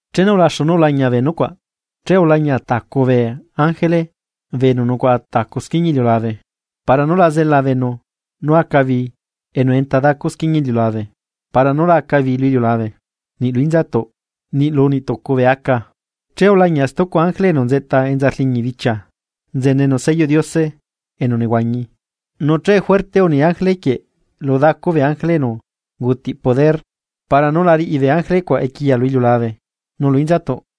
Chenu ulaxu nú ulañia bee nucuaꞌ, che ulañia tacu bee ángele bee enu nucuaꞌa tacu squiñia iliulabe para nú la zela beenu nú aca bi enu enta dacu squiñia iliulabe, para nú la aca bi lu iliulabe, niꞌ lu inzatuꞌ, niꞌ lu niꞌ tucu bee aca. Che ulañia stucu ángele enu nzeꞌta enza rliñi bichia, nzenenu selloꞌ Diose enu nehuañi. Nu che fuerte uni ángele quieꞌ lu dacu bee ángele enu ungutiꞌ poder para nú la riꞌi bee ángele cuaꞌ equiya lu iliulabe nu lu inzatuꞌ: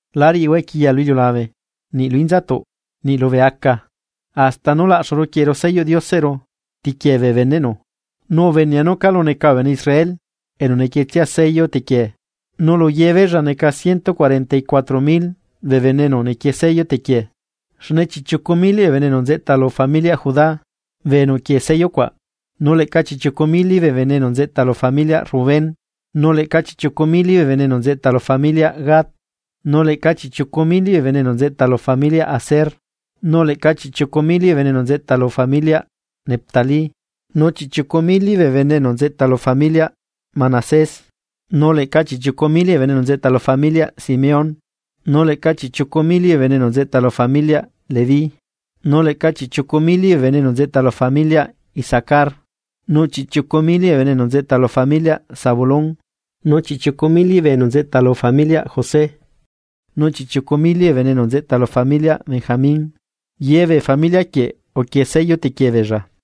―La riꞌihua equiya lu iliulabe, niꞌ lu inzatuꞌ, niꞌ lubee aca, hasta nú laꞌxuru quieꞌeru selloꞌ Dioseꞌru tequiee bee beneꞌnu. Nu ubenea nú calu neca bee bene Israel enu nequietsia sello tequiee. Nu luye beella, neca ciento cuarenta y cuatro mil bee bene enu nequie sello tequiee. Xne chiꞌchiucu mili bee bene enu nzeꞌta lu familiaꞌ Judá bee enu uquie sello cuaꞌ. Nu leꞌca chiꞌchiucu mili bee bene enu nzeꞌta lu familiaꞌ Rubén, nu leꞌca chiꞌchiucu mili bee bene enu nzeꞌta lu familiaꞌ Gad. Nu leꞌca chiꞌchiucu mili bee enu nzeꞌta lu familiaꞌ Aser, nu leꞌca chiꞌchiucu mili bee enu nzeꞌta lu familiaꞌ Neftalí, nu chiꞌchiucu mili bee enu nzeꞌta lu familiaꞌ Manasés, nu leꞌca chiꞌchiucu mili bee enu nzeꞌta lu familiaꞌ Simeón, nu leꞌca chiꞌchiucu mili bee enu nzeꞌta lu familiaꞌ Leví, nu chiꞌchiucu mili bee enu nzeꞌta lu familiaꞌ Isacar, nu chiꞌchiucu mili bee enu nzeꞌta lu familiaꞌ Zabulón, nu chiꞌchiucu mili bee enu nzeꞌta lu familiaꞌ José, nu chiꞌchiucu mili bee enu nzeꞌta lu familiaꞌ Benjamín ye bee familia quieꞌ uquie sello tequie beella.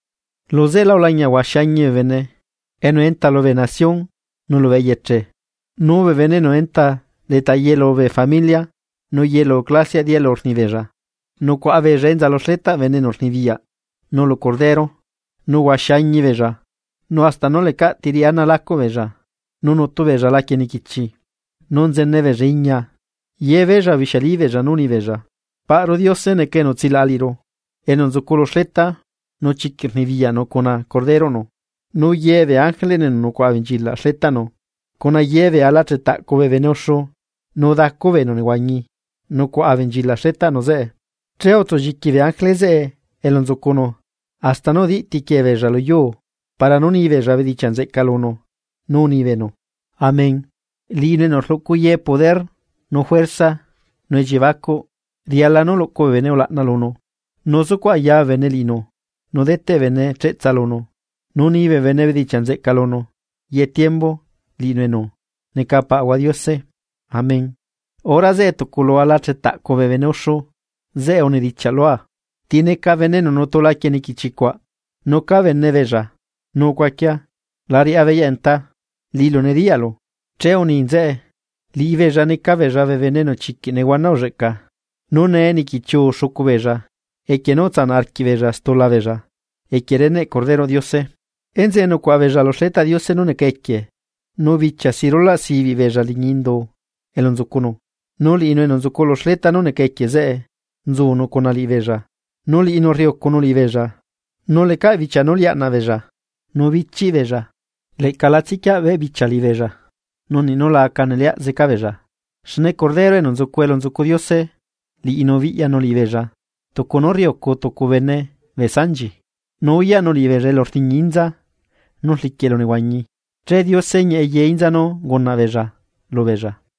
Lu zeꞌela ulañia huaxi añi bee bene, enu enta lubee nación nu lubee eyeche, nu bee bene enu enta leta yelu bee familia nu yelu clasiaꞌ dialu rni beella. Nucuaꞌa beella enza lu xletaꞌ bene enu rnibiyaꞌ nu lu Cordero, nu huaxi añi beella hasta nú lecaꞌ ti riꞌi ana lacuꞌ beella, nu nutu beella laquie niquichi, nu nzene beella iñia. Ye beella ubixiali beella nu unibeella: Paꞌru Diose neca enu utsilaꞌa liꞌiru nu nzucunu lu xleta, nu chiquiꞌ rnibiyaꞌnu cuna Corderoꞌnu. Nu ye bee ángele enu nucuaꞌa abenchilaꞌ xletaꞌnu cuna ye bee ala chetaꞌcu bee bene uxu nu dacu bee enu nehuañi, nucuaꞌa abenchilaꞌ xletaꞌnu zeꞌe, che utsulliqui bee ángele zeꞌe elu nzucunu hasta nú udiꞌ tiquiee beella lu yuu para nú ni beella bedichiaꞌ nzeꞌca lunu, nu uni beenu: ¡Amén! Liꞌinu enu rluꞌcu ye poder nu juerza nu elliebacuꞌ nu riala nú luꞌcu bee bene ulaꞌna lunu, nu zucuꞌ aya bee bene liꞌinu nu deteꞌ bee bene cheꞌtsa lunu, nu ni bee bene bedichiaꞌ nzeꞌca lunu, ye tiembu liꞌinu enu neca Paꞌahua Diose. Amén. Hora zeꞌe tucu lu alachetaꞌcu bee bene uxu zeꞌe unedichiaꞌ lua: ―¿Ti neca bee bene enu nutu laquie niquichi cuaꞌ, nu ca bene beella? ―Nu ucuaquia, la riꞌá beyaꞌ Detá, liꞌilu nediyaꞌlu. Che uni nzeꞌe: ―Liꞌibeella neca beella bee bene enu chiquiꞌ nehuana ulleꞌca, nu nee nequichiuu xucu beella equie nú utsanaꞌ arquiꞌbeella stula beella, equie cuendaꞌ reneꞌ Corderoꞌ Diose. ’Enzeꞌe nucuaꞌa beella lu xletaꞌ Diose nú neca equie nu bichia si rulaꞌ sibiꞌ beella liñi indu elu nzucunu, nu liꞌinu enu nzucu lu xleta nú neca equie zeꞌe, nzunu cuna liꞌibeella, nu liꞌinu rriucunu liꞌibeella. Nu lecaꞌ bichia nú liaꞌnaꞌ beella, nu bichiꞌ beella, leꞌca la tsiquiaꞌ beꞌbichia liꞌibeella nu niꞌ la aca neleaꞌ zeca beella, xne Cordero enu nzu elu nzucu Diose. Liꞌinu biꞌyanu liꞌibeella tucu nú rriucu tucu bene bee sanchi, nu uyaꞌnu liꞌibeella elu rliñi inza nú rliquiꞌ elunehuañi, che Diose ñieꞌe ye inza nú ungunaꞌ beella lubeella.